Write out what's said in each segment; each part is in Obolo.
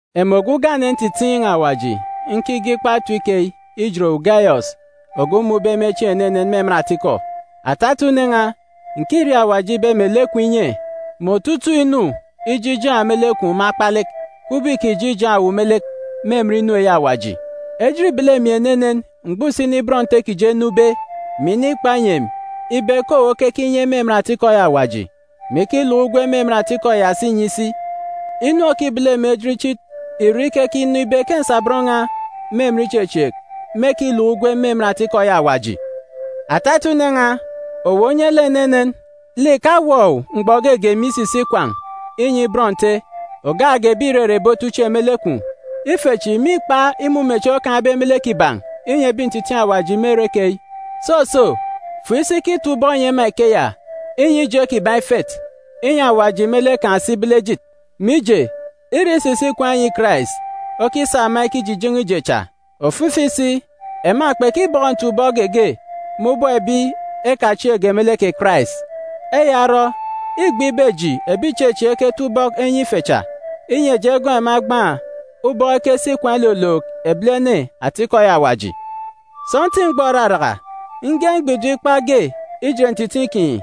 Emi ogwu ugane ntitiin̄ Awaji nkige ikpa etip keyi ijet owu, Gayọs ogwu mmun̄be me chieen̄ enenen me emen atikọ. Atata une n̄a, ǹkiriaak Awaji ibe mè lek kwun̄ inye, mè otutuuk inu ije ijaan̄ me lek kwun̄ me akpalek, kubọk îkije ijaan̄ owu me lek me emen inu eyi Awaji. Ejit îbele emi enenen mgbọ usini bọn Nte kiji enube, mè inikpa inyi emi ibe ke owu okeke inye me emen atikọ eyi Awaji, mè ikiluk ugwem me emen atikọ ya si inyi isi. Inu òkibele emi ejit ichit ìre ikekinọ ibe ke nsabọn n̄a me emen ichechieek mêkiluk ugwem me emen atikọ eyi Awaji. Atata une n̄a, owu onye lek enenen. Lek ìkawọ owu mgbọ geege me isisi ikwaan̄ inyi bọn Nte, ògak ge ebi ìrere ebi ichen me lek kwun̄. Ife chi mîkpa imumechieen̄ okaan̄be me lek kiban̄ inyi ebi ntitiin̄ Awaji me ere keyi. Soso, fo isi kitap ubọk nyi ema ikeya, inyi ije kiban̄ ifet, inyi Awaji me lek kan̄ si ibele ejit. Mije, îre isisi ikwaan̄ inyi Karais okisa ema ikijijen̄e ije cha. Ofifi si, ema kpekibọkọ ntap-ubọk geege me ubọk ebi ekachieekge me lek kè Karais. Eya orọ, îgbe ibe eji ebi ìchechieek eketap ubọk enyi ife cha, inyi eji egọọk ema egbaan̄ ubọk ekesi ikwaan̄ ilolook ebilene atikọ eyi Awaji. Sọntiik mgbọ òraraka, nge mgbidim ikpa ge ijet ntitiin̄ kinyi.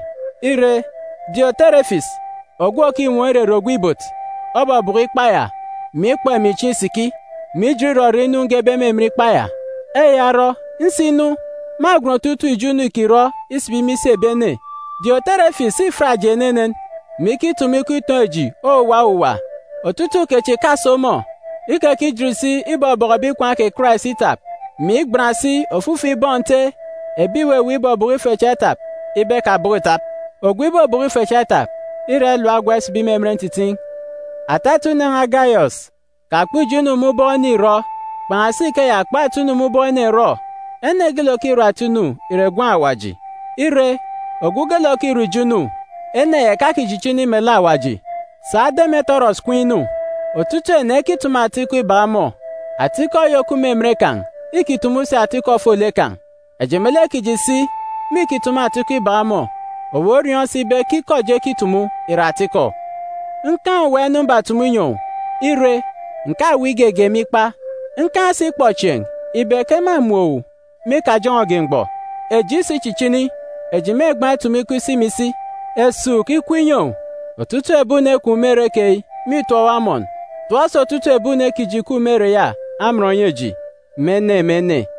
Ire, Dioterefis, ogwu òkinwọọn̄ irere ogwu ibot, obọbọkọ ikpa ya, mè ikpọ emi chieen̄ isiki, mè ijit irọrọ inu ngebe me emen ikpa ya. Eya orọ, nsinu, mâgwen otutuuk ijo inu îkirọ isibi me isi ebi ene. Dioterefis îfiat eji enenen, mè ikitumu ikọ itoon̄ eji owuwa owuwa. Otutuuk kechi ìkaso ọmọ! Ikekijit si ibọbọkọ ebi ikwaan̄ kè Karais itap, mè igban si ofifi bọn Nte ebi ìweweek ibọbọkọ ife cha itap ibe ekabọkọ ìtap. Ogwu ibobọkọ ife cha itap, îra ilap ogwa isibi me emen ntitiin̄. Atata une n̄a Gayọs, kakpọ ijo inu me ubọk ene ìrọ. Kpan̄asi ikeya kpọ ata inu me ubọk ene rọ. Ene geelek òkirọ ata inu ìre gwun̄ Awaji. Ire, ogwu geelek òkirọ ijo inu, ene ya ìkachichini melek Awaji. Sa Demetirọs kween̄ inu! Otutuuk ene ekitumu ata ikọ ibak ọmọ. Atikọ eyi òkup me emen kan̄ îkitumu si ata ikọ ofolek kan̄. Eji me lek kiji si mîkitumu ata ikọ ibak ọmọ. Owu oriọọn̄ si ibe ke ikọ eji ekitumu ìre atikọ. Nkaan̄ owuwa inu mbatumu inyi owu. Ire, ǹkaweek igege me ikpa. Nkaan̄ si ikpọchieen̄ ibe ke mâmun̄ owu me ikajọn̄ọge mgbọ. Eji isichichini, eji mêgbaan̄ itumu ikọ isi mè isi. Esuuk ikup inyi owu. Otutuuk ebi une kwun̄ me ere keyi mîtọp owu amọn. Tọp si otutuuk ebi une kiji ìkup me ere ya amọn nyi eji, me ene, me ene.